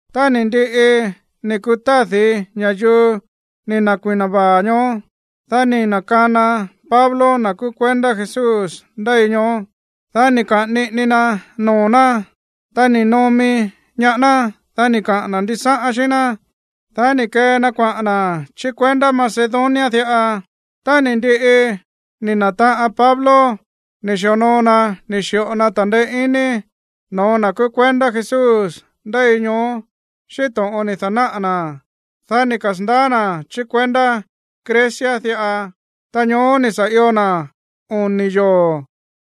Tá ni̱ ndiꞌi ni̱ kutádi̱ ña̱yuu ni̱ na̱kui̱na vaa̱ ñoó, dá ni̱ na̱kana Pablo na̱ kúú kuendá Jesús ndéi ñoó. Dá ni̱ kaꞌa̱n niꞌini na noo̱ ná, ta ni̱ nomi ñaá ná. Dá ni̱ kaꞌa̱n na̱ ndisáꞌán xíꞌín ná. Dá ni̱ kee na kuaꞌa̱n na̱ chí kuendá Macedonia diꞌa. Tá ni̱ ndiꞌi ni̱ na̱taꞌan Pablo ni̱ xi̱onoo na ni̱ xi̱ꞌo na ta̱ndeé iní noo̱ na̱ kúú kuendá Jesús ndéi ñoó xíꞌín to̱ꞌon ni̱ da̱náꞌa̱ na̱, dá ni̱ kasa̱ndaá na̱ chí kuendá Grecia diꞌa. Ta ñoó ni̱ sa̱ io na̱ oni̱ yoo̱.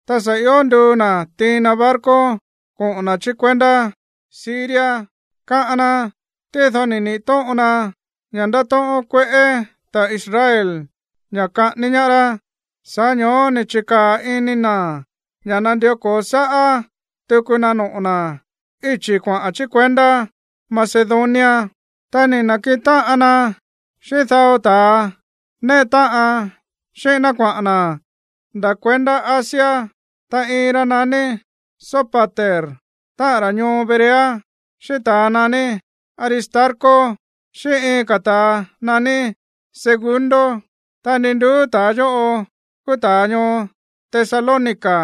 Ta sa̱ io nduu na̱ tiin na barco koꞌo̱n na̱ chí kuendá Siria, káꞌán ná. Tído ni̱ niꞌi̱ tóꞌon na ña̱ ndátóꞌón kueꞌé ta̱ Israel ña̱ kaꞌání ñaá rá. Sa̱ꞌá ño̱ó ni̱ chi̱kaa̱ ini na̱ ña̱ nandió ko̱o sáꞌá tuku na noꞌo̱ na̱ íchi̱ kuaꞌa̱n chí kuendá Macedonia. Ta ni̱ na̱kiꞌin táꞌan na xíꞌín dao ta̱a néꞌe táꞌan xíꞌín ná kuaꞌa̱n na̱ nda̱ kuendá Asia. Ta iin ra naní Sópater, táꞌa̱n ra̱ ñoo Berea, xíꞌín ta̱ naní Aristarco, xíꞌín iin ka̱ ta̱ naní Segundo. Ta ndi nduú ta̱a yóꞌo kúú ta̱ ñoo Tesalónica.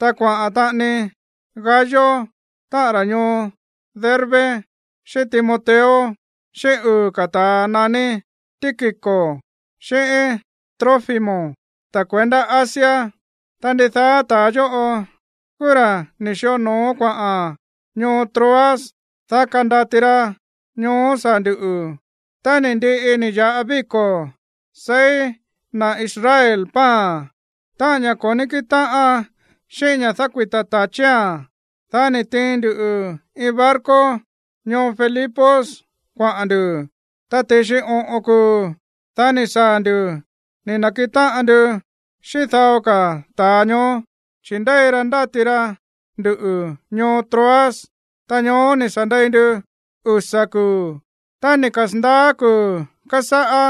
Ta kuaꞌa̱n taꞌani Gayo, táꞌa̱n ra̱ ñoo Derbe, xíꞌín Timoteo, xíꞌín uu̱ ka̱ ta̱a naní Tíquico xíꞌín Trófimo, ta̱ kuendá Asia. Ta ndidaá ta̱a yóꞌo kúú ra̱ ni̱ xi̱onoo kuaꞌa̱n ñoo Troas, dá kandati ra ñoó saa̱ ndu̱. Tá ni̱ ndiꞌi ni̱ ya̱ꞌa víko̱ seí na̱ Israel pan, táꞌa̱n ña̱ ko̱ ní kíꞌin táꞌan xíꞌín ña̱ dákuita̱ ta̱chía̱n, dá ni̱ tiin ndu iin barco ñoo Filipos kuaꞌa̱n ndu̱. Ta ti̱xi oꞌo̱n kuu̱, dá ni̱ saa̱ ndu̱ ni̱ na̱kiꞌin táꞌan ndu xíꞌín dao ka̱ ta̱a ñoó, chi̱ ndéi ra ndáti ra ndu̱ ñoo Troas. Ta ñoó ni̱ sa̱ ndei ndu usa̱ kuu̱. Tá ni̱ kasa̱ndaá kuu̱ kásáꞌá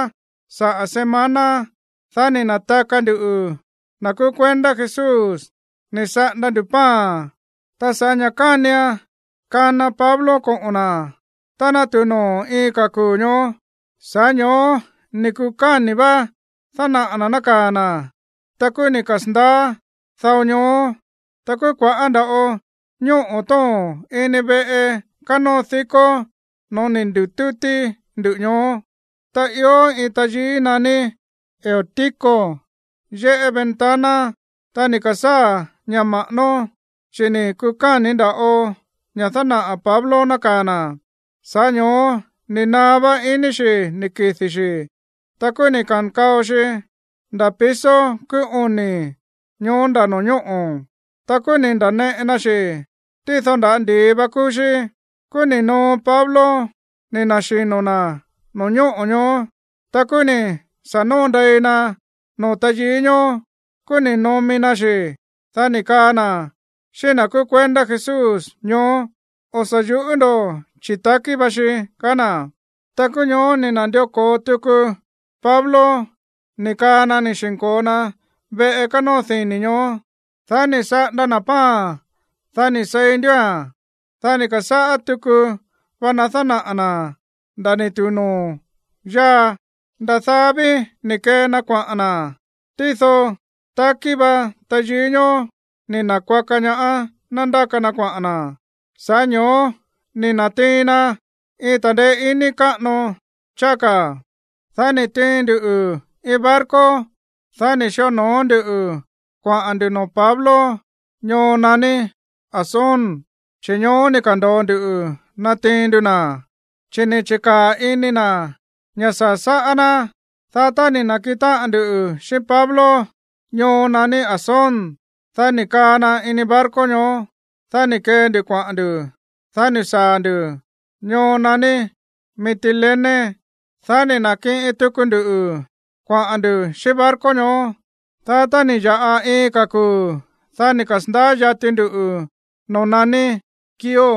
saꞌa̱ semana, dá ni̱ na̱taka nduꞌu̱, na̱ kúú kuendá Jesús, ni̱ saꞌanda ndu̱ pan. Ta sa̱ꞌá ña̱ kánian kana Pablo koꞌo̱n na̱ tá ná tu̱u noo̱ iin ka̱ kuu̱ ñoó, sa̱ꞌá ño̱ó ni̱ kukáni̱ vá dánaꞌa̱ na̱ nákaa̱ na̱. Ta kúú ni̱ kasa̱ndaá dao ñoó. Ta kúú kua̱ꞌá nda̱ꞌo ñóꞌo̱ tóo̱n ini veꞌe kánóo dikó noo̱ ni̱ ndi̱tútí ndú ñoó. Ta ió iin tayií naní Eutico yéꞌé ventana, ta ni̱ ka̱sáa̱ ña̱ ma̱ꞌánó, chi̱ ni̱ kukáni̱ nda̱ꞌo ña̱ dánaꞌa̱ Pablo nákaa̱ na̱, sa̱ꞌá ño̱ó ni̱ naá vá iní xi̱ ni̱ kidi̱ xi̱. Ta kúú ni̱ ka̱nkao xi nda̱ piso kúú oni̱ ñoó nda̱ no̱ñóꞌo̱. Ta kúú ni̱ nda̱neꞌe na xi̱, tído nda̱á ndi̱i va kúú xí. Kúú ni̱ noo Pablo ni̱ na̱xino̱ na̱ no̱ñóꞌo̱ ñoó. Ta kúú ni̱ sa̱ noo ndei na noo̱ tayií ñoó. Kúú ni̱ nomi na xi̱. Dá ni̱ kaa na̱ xíꞌín na̱ kúú kuendá Jesús ñoó: ―O̱ sa̱ yu̱ꞌú ndo̱, chi̱ takí va xi ―kaá na̱. Ta kúú ñoó ni̱ na̱ndió ko̱o tuku Pablo ni̱ kaa na ni̱ xi̱nko̱o na veꞌe kánóo dini̱ ñoó. Dá ni̱ saꞌanda na̱ pan, dá ni̱ seí ndúa̱n. Dá ni̱ ka̱sáꞌá tuku va na dánaꞌa̱ na̱ nda̱ ni̱ tu̱u noo̱ yáa. Nda̱ daá ví ni̱ kee na kuaꞌa̱n na̱. Tído takí va tayií ñoó ni̱ na̱kuaka ñaá ná ndáka na kuaꞌa̱n na̱. Sa̱ꞌá ño̱ó ni̱ na̱tiin na iin ta̱ndeé iní káꞌano cháá ka̱. Dá ni̱ tiin ndu iin barco, dá ni̱ xi̱onoo ndu kuaꞌa̱n ndu̱ noo̱ Pablo ñoo naní Asón, chi̱ ñoó ni̱ ka̱ndo̱o ndu natiin ndu na̱, chi̱ ni̱ chi̱kaa̱ ini na̱ ña̱ saa̱ sáꞌá ná. Dá tá ni̱ na̱kiꞌin táꞌan ndu xíꞌín Pablo ñoo naní Asón, dá ni̱ kaa na ini barco ñoó. Dá ni̱ kee ndu kuaꞌa̱n ndu̱. Dá ni̱ saa̱ ndu̱ ñoo naní Mitilene. Dá ni̱ na̱kiꞌin tuku ndu kuaꞌa̱n ndu̱ xíꞌín barco ñoó. Dá tá ni̱ ya̱ꞌa iin ka̱ kuu̱, dá ni̱ kasa̱ndaá yati ndu noo̱ naní Quío.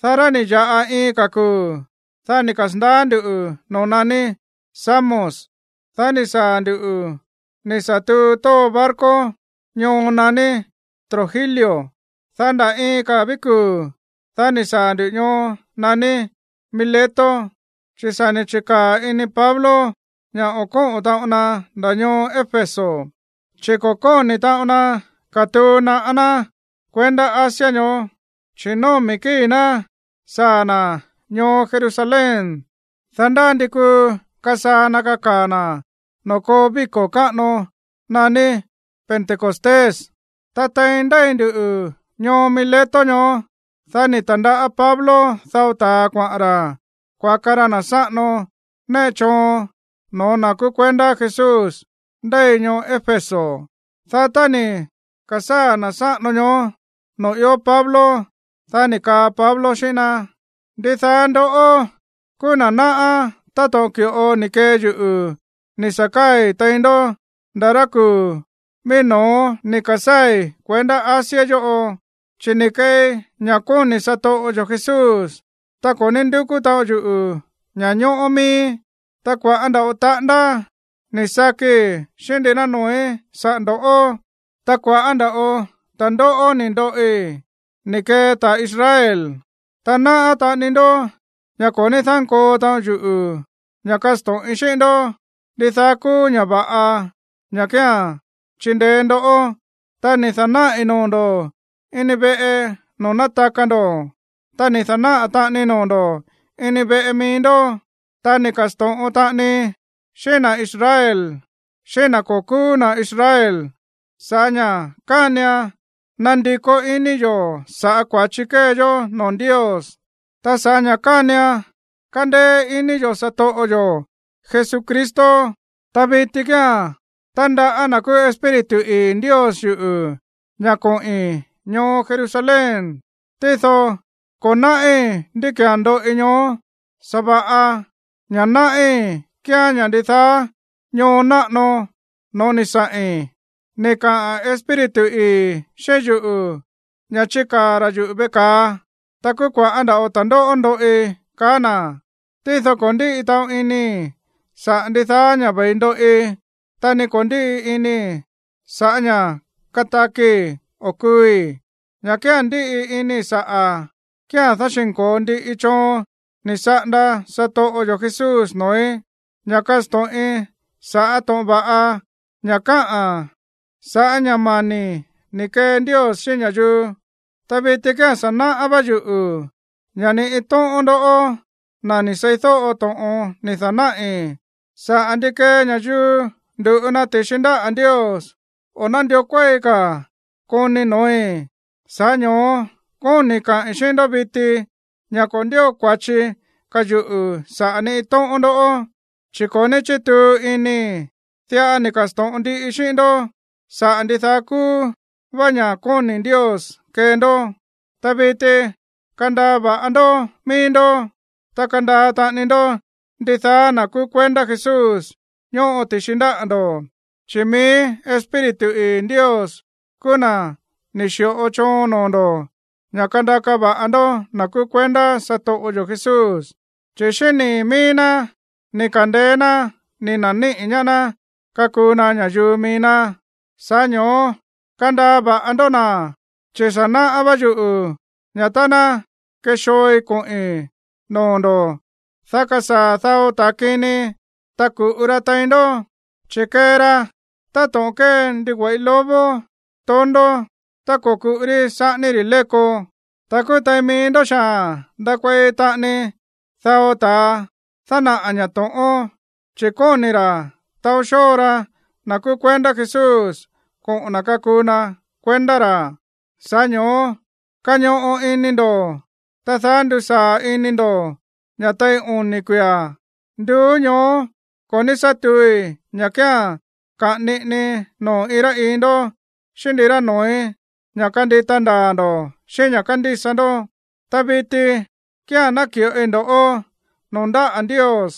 Dá tá ni̱ ya̱ꞌa iin ka̱ kuu̱, dá ni̱ kasa̱ndaá ndu̱ noo̱ naní Samos. Dá ni̱ saa̱ ndu̱ ni̱ sa̱ tuu tóo barco ñoo naní Trogilio. Dá nda̱ iin ka̱ ví kuu̱, dá ni̱ saa̱ ndu̱ ñoo naní Mileto. Chi̱ sa̱ ni̱ chi̱kaa̱ ini Pablo ña̱ o̱ kóꞌo̱n taꞌon na nda̱ ñoo Éfeso, chi̱ ko̱ kóni̱ taꞌon na katuu naꞌá ná kuendá Asia ñoó. Chi̱ nómi̱ kíi̱ ná saa̱ na̱ ñoo Jerusalén, dá ndá ndi kuu kasaa̱ na̱ kakaa̱ na̱ noo̱ koo víko̱ káꞌano naní Pentecostés. Ta tein ndéi ndu ñoo Mileto ñoó, dá ni̱ ta̱ndaꞌá Pablo dao ta̱a kuaꞌa̱n ra̱ kuaka ra na̱ sáꞌano néꞌe choon no̱ó na̱ kúú kuendá Jesús ndéi ñoo Éfeso. Dá tá ni̱ ka̱sáa̱ na̱ sáꞌano ñoó noo̱ ió Pablo, dá ni̱ kaa Pablo xíꞌín ná: ―Ndidaá ndoꞌó kúú na̱ náꞌá táto̱ꞌon ki̱ꞌo ni̱ kee yuꞌu̱ ni̱ sa̱ káa̱i̱ tein ndó nda̱ rá kuu̱ mií no̱ó ni̱ ka̱sáa̱i̱ kuendá Asia yóꞌo. Chi̱ ni̱ keei ña̱ kóni̱ satoꞌo yo̱ Jesús, ta ko̱ ní ndúkú taꞌon yuꞌu̱ ña̱ñóꞌó miíí. Ta kua̱ꞌá nda̱ꞌo taꞌándá ni̱ sakii xíꞌín ndirá noo̱í saꞌa̱ ndo̱. Ta kua̱ꞌá nda̱ꞌo ta̱ndóꞌó ni̱ ndoꞌi ni̱ kee ta̱ Israel. Ta náꞌá taꞌani ndó ña̱ ko̱ ní dánkoo taꞌon yuꞌu̱ ña̱ kasto̱ꞌin xíꞌín ndó ndidaá kúú ña̱ va̱ꞌa ña̱ kía̱n chindeé ndó. Ta ni̱ da̱náꞌi̱ noo̱ ndo̱ ini veꞌe noo̱ nátaka ndo̱, ta ni̱ da̱náꞌa̱ taꞌanii noo̱ ndo̱ ini veꞌe mií ndó. Ta ni̱ ka̱sto̱ꞌon taꞌanii xíꞌín na̱ Israel xíꞌín na̱ ko̱ kúú na̱ Israel sa̱ꞌá ña̱ kánian nandikó iní yo̱ sa̱ꞌá kua̱chi kée yó noo̱ Ndios, ta sa̱ꞌá ña̱ kánian kándéé iní yo̱ satoꞌo yo̱ Jesucristo. ’Ta viti kía̱n tándaꞌá na̱ kúú Espíritu ii̱ Ndios yuꞌu̱ ña̱ koꞌi̱n ñoo Jerusalén. Tído ko̱ náꞌí ndí ki̱án ndoꞌi ñoó. Sa̱va̱ꞌa ña̱ náꞌí kíán ña̱ ndidaá ñoo náꞌano no̱ó ni̱ saꞌi̱n, ni̱ kaꞌa̱n Espíritu ii̱ xíꞌín yuꞌu̱ ña̱ chikaa̱ ra̱ yuꞌu̱ veꞌe ka̱a. Ta kúú kua̱ꞌá nda̱ꞌo ta̱ndóꞌó ndoꞌi, kaá na̱. Tído ko̱ ndíꞌi taꞌon inii̱ saꞌa̱ ndidaá ña̱ ve̱i ndoꞌi. Ta ni ko̱ ndíꞌi inii̱ sa̱ꞌá ña̱ katakii̱ o kuui̱. Ña̱ kía̱n ndíꞌi inii̱ saꞌa̱ kía̱n dáxi̱nko̱o ndiꞌii choon ni̱ saꞌanda satoꞌo yo̱ Jesús noo̱í, ña̱ kasto̱ꞌin sa̱ꞌá to̱ꞌon va̱ꞌa ña̱ káꞌa̱n sa̱ꞌá ña̱ mani̱ ni̱ kee Ndios xíꞌín ña̱yuu. ’Ta viti kía̱n sa̱ náꞌá vá yuꞌu̱ ña̱ ni iin tóꞌón ndoꞌó, na̱ ni̱ seídóꞌo to̱ꞌon ni̱ da̱náꞌi̱ saꞌa̱ ndi kee ña̱yuu ndu̱ꞌu na ti̱xi ndáꞌa̱ Ndios, o̱ nándió kuéi ka̱ koni noo̱í. Sa̱ꞌá ño̱ó kóni̱ kaꞌi̱n xíꞌín ndó viti ña̱ ko̱ ndío kua̱chi ka̱ yuꞌu̱ saꞌa̱ ni iin tóꞌón ndoꞌó, chi̱ ko̱ ní chítuu inii̱, diꞌa ni̱ ka̱sto̱ꞌon ndiꞌii xíꞌín ndó saꞌa̱ ndidaá kúú vá ña̱ kóni̱ Ndios kee ndó. ’Ta viti, kandaa va̱ꞌa ndó mií ndó, ta kandaa taꞌani ndó ndidaá na̱ kúú kuendá Jesús ñóꞌo ti̱xi ndáꞌa̱ ndo̱. Chi̱ mií Espíritu ii̱ Ndios kúú na̱ ni̱ xi̱ꞌo choon noo̱ ndo̱ ña̱ kandaka va̱ꞌa ndó na̱ kúú kuendá satoꞌo yo̱ Jesús, chi̱ xíꞌín nii̱ mií ná ni̱ ka̱ndeé ná ni̱ na̱níꞌi̱ ñaá ná kakuu na ña̱yuu mií ná. Sa̱ꞌá ño̱ó kandaa va̱ꞌa ndó na̱, chi̱ sa̱ náꞌá vá yuꞌu̱ ña̱ tá ná kexooi koꞌi̱n noo̱ ndo̱, dá kasaa̱ dao ta̱a kini, ta ku̱ꞌu ra tein ndó, chi̱ kee ra táto̱ꞌon kée ndigüe̱ꞌi lobo tondó tá ko̱kuꞌu rí saꞌání rí léko. Ta kúú tein mií ndó xaa̱n ndakuei taꞌani dao ta̱a dánaꞌa̱ ña̱ to̱ꞌón, chi̱ kóni̱ ra̱ taó xóo ra na̱ kúú kuendá Jesús koꞌo̱n na̱ kakuu na kuendá ra̱. Sa̱ꞌá ño̱ó kañoꞌo ini ndo̱, ta daá ndusaa̱ ini ndo̱ ña̱ tein oni̱ kuia̱, nduú ñoó ko̱ ní sá tuui ña̱ kía̱n kaꞌa̱n niꞌini noo̱ iin rá iin ndó xíꞌín ndirá noo̱í ña̱ kandita ndaa̱ ndo̱ xíꞌín ña̱ kándísa ndó. ’Ta viti kía̱n náki̱ꞌoi ndo̱ꞌó noo̱ ndáꞌa̱ Ndios,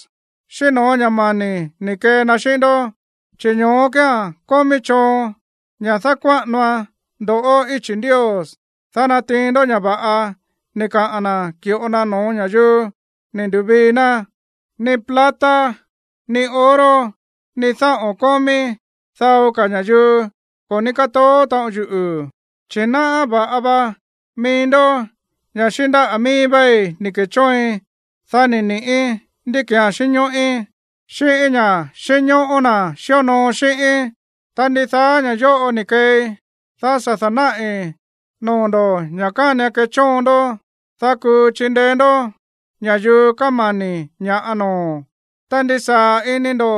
xíꞌín no̱ó ña̱ mani̱ ni̱ kee na xíꞌín ndó. Chi̱ ñoó kía̱n kómí choon ña̱ dákuáꞌanoan ndo̱ꞌó íchi̱ Ndios, dá natiin ndó ña̱ va̱ꞌa ni̱ kaa na̱ ki̱ꞌo na no̱ó ña̱yuu ni̱ ndu̱vii ná. ’Ni plata ni oro ni dáꞌo̱n kómí dao ka̱ ña̱yuu ko̱ ní kátoó taꞌon yuꞌu̱, chi̱ náꞌá va̱ꞌa va mií ndó ña̱ xíꞌín ndáꞌa̱ mií váí ni̱ ke̱chóoin, dá ni̱ ni̱ꞌí ndí ki̱án xínñóꞌí, xíꞌín ña̱ꞌa xínñóꞌó na̱ xíonoo xíꞌíín. Ta ndidaá ña̱ yóꞌo ni̱ keei, dá sa̱ da̱náꞌi̱ noo̱ ndo̱ ña̱ kánian kechóon ndó, dá kuu chindeé ndó ña̱yuu kámani̱ ña̱ꞌa noo̱. Ta ndisaa̱ ini ndo̱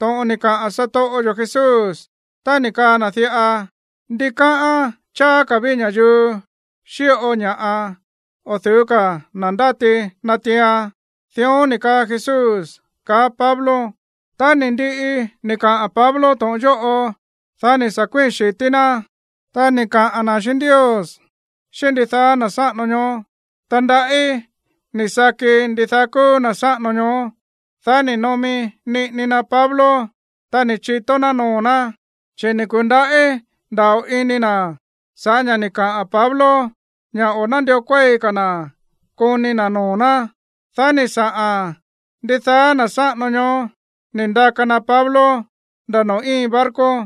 to̱ꞌon ni̱ kaꞌa̱n satoꞌo yo̱ Jesús tá ni̱ kaa na̱ diꞌa: “Ndikáꞌán cháá ka̱ ví ña̱yuu xíꞌo ña̱ꞌa o̱ du̱ú ka̱ na̱ ndáti natiian.” Dión ni̱ kaa Jesús ―kaá Pablo. Tá ni̱ ndiꞌi ni̱ kaꞌa̱n Pablo to̱ꞌon yóꞌo, dá ni̱ sa̱ kuíi̱n xi̱tí ná, ta ni̱ kaꞌa̱n na̱ xíꞌín Ndios xíꞌín ndidaá na̱ sáꞌano ñoó. Ta ndaꞌí ni̱ saki ndidaá kúú na̱ sáꞌano ñoó. Dá ni̱ nomi niꞌini na Pablo, ta ni̱ chitó ná noo̱ ná. Chi̱ ni̱ ku̱ndaꞌí nda̱ꞌo ini na̱ sa̱ꞌá ña̱ ni̱ kaa Pablo ña̱ o̱ nándió kuéi ka̱ na̱ koni na̱ noo̱ ná. Dá ni̱ saꞌa̱n ndidaá na̱ sáꞌano ñoó ni̱ ndaka na Pablo nda̱ noo̱ íin barco.